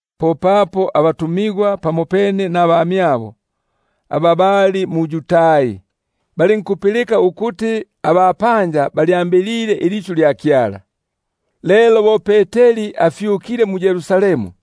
Popapo abatumigwa pamopene nabamyabo, aba bali mu-Yudai, balinkupilika ukuti abapanja balyambilile ilisyu lya Kyala. Lelo bo Peteri afyukile mu-Yerusalemu,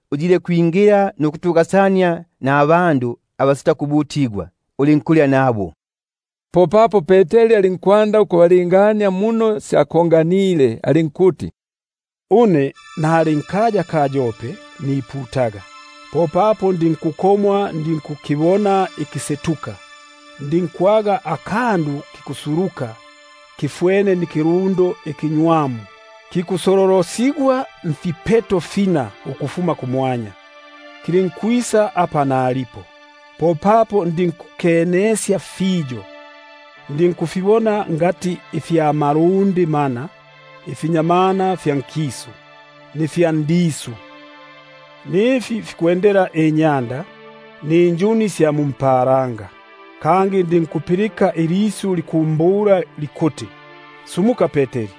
lingile mbandu abasitakubutigwako, ulinkulya nabo. Popapo Peteri alinkwanda ukubalingania muno syakonganile, alinkuti: Une nali nkaya ka Yope niputaga, popapo ndinkukomwa ndinkukibona ikisetuka, ndinkwaga akandu kikusuluka kafwene bo ikilundo ikinywamu kikusololosigwa mfipeto fina ukufuma kumwanya, kilinkwisa apa nalipo. Popapo ndinkukenesya fiyo, ndinkufibona ifya malundi mana ifya nkisu, ifya ndisu, nifi fikwendela inyanda, ninjuni sya kumwanya. Kangi ndinkupilika ilisyu likumbula likuti: Sumuka Peteri,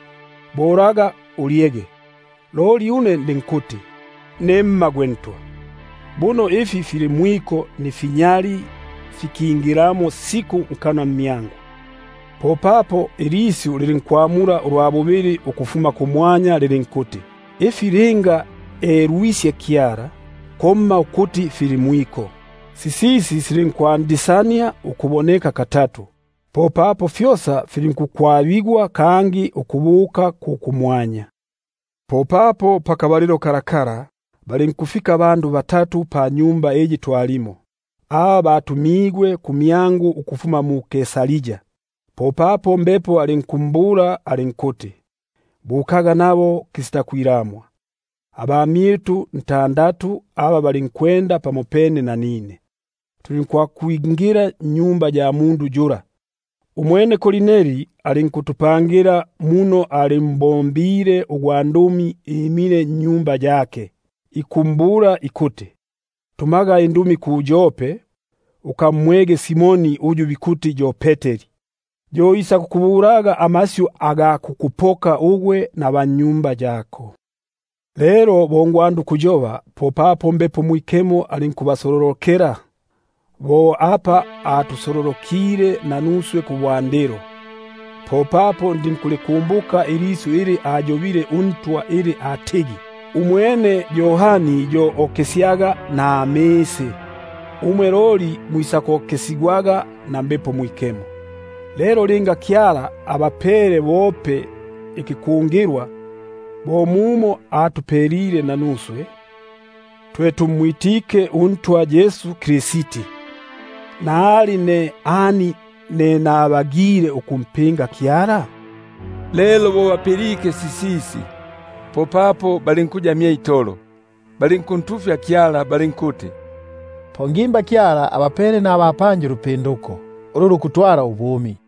holaga ulyege. Loli ndinkuti: Nemma gwe Ntwa, buno ifi fili mwiko nifinyali fikingilamo siku nkanwa mmyangu. Popapo ilisyu lilinkwamula ulwa bubili ukufuma kumwanya lilinkuti: Ifi linga elwisye Kyala, komma ukuti fili mwiko, Sisisi silinkwandisania ukuboneka katatu, popapo fyosa fili- nkukwabigwa kangi ukubuka ku kumwanya. Popapo pakabalilo kako, balinkufika abandu batatu panyumba iyi twalimo, aba batumigwe kumyangu ukufuma mu-Kaisaria. Popapo Mbepo alinkumbula alinkuti: Bukaga nabo kisitakwilamwa. Abamyitu ntandatu aba balinkwenda pamopene nanine, tulinkwakwingila nnyumba ya mundu yula. Umwene alinkutupangila muno alimbonile ugwandumi imile nnyumba yake, ikumbula ikuti: Tumaga indumi mu-Yope, ukamwege Simoni uyu bikuti yo Peteri; yo isakukubulaga amasyu aga kukupoka ugwe naba nnyumba yako. Lelo bo nikwanda ukuyoba, popapo Mbepo Mwikemo alinkubasololokela, bo apa atusolo- lokile nanuswe kubwandilo. Popapo ndinkulikumbuka ilisyu ili aliyobile uNtwa ili atigi: Umwene Yohani yo okesyaga namisi, umwe loli mwisakokesigwaga na Mbepo Mwikemo. Lelo linga Kyala abapele bope ikikungilwa bo mumo atupelile nanuswe, twe tumwitike uNtwa Yesu Kristi, nali ne ani ne nabagile ukumpinga Kyala? Lelo bo bapilike sisisi, popapo balinkuya mye itolo, balinkuntufya Kyala balinkuti: Po ngimba Kyala abapele nabapanja ulupinduko, ulu lukutwala ubumi.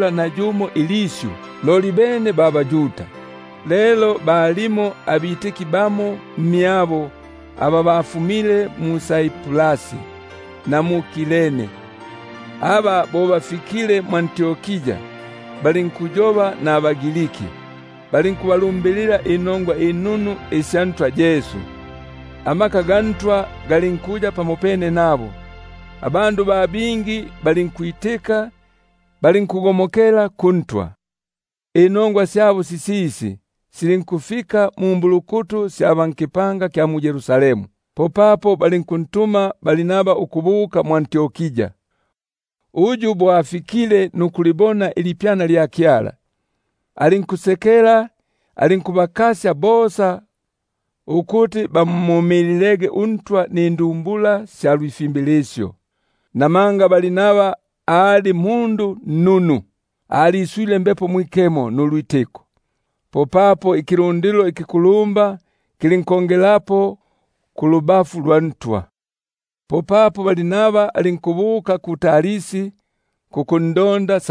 nayumo ilisyu, loli bene ba baYuda. Lelo balimo bamo mmyabo aba bafumile mu-Saiprasi na mu-Kireni, aba bo bafikile mwʼAntiokia, balinkuyoba nabaGriki, balinkuba- fumukisya inongwa inunu isya Ntwa Yesu. Kyope nikiboko kya Ntwa lulinkuya nabo; ba bingi balinkwitika, balinkugo- mokela kuNtwa. Inongwa syabo sisisi, silinkufika na mumbulukutu sya ba nkipanga kya mu-Yerusalemu: popapo bali- nkuntuma Barnaba ukubuka mwʼAntiokia; uyu bo afikile nukulibona ilipyana lya Kyala, alinkusekela, alinkubakasya bosa ukuti bamumililege uNtwa nindumbula isya lwifimbilisyo. Namanga ali mundu nnunu, aliswile Mbepo Mwikemo nulwitiko; popapo ikilundilo ikikulumba kilinkongelapo kulubafu lwa Ntwa. Umwene alinkubuka mu-Tarsi kukundonda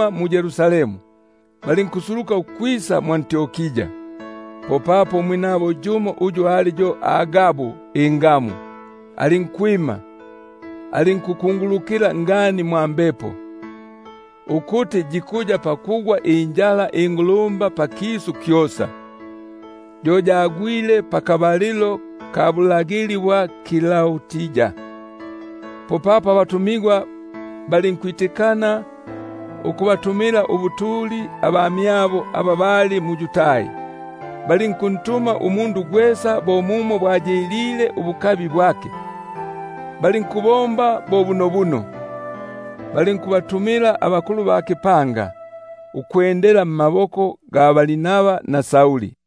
mu-Yerusalemu, balinkusuluka mwʼAntiokia. Popapo umwinabo yumo, uyu ali yo Agabu ingamu, alinkwima, alinkuyobela ngani mwa Mbepo, ukuti yikuya pakugwa injala ingulumba pakisu kyosa; yo iyi yagwile pakabalilo ka Klaudia. Popapo abafundigwa balinkwitikana ukubatumila ubutuli abamyabo aba bali mu-Yudai, balinkutuma umundu gwesa bo mumo bwayilile ubukabi bwake. Balinkubomba bo bunobuno, balinkubatumila abakulumba mmaboko ga Barnaba na Sauli.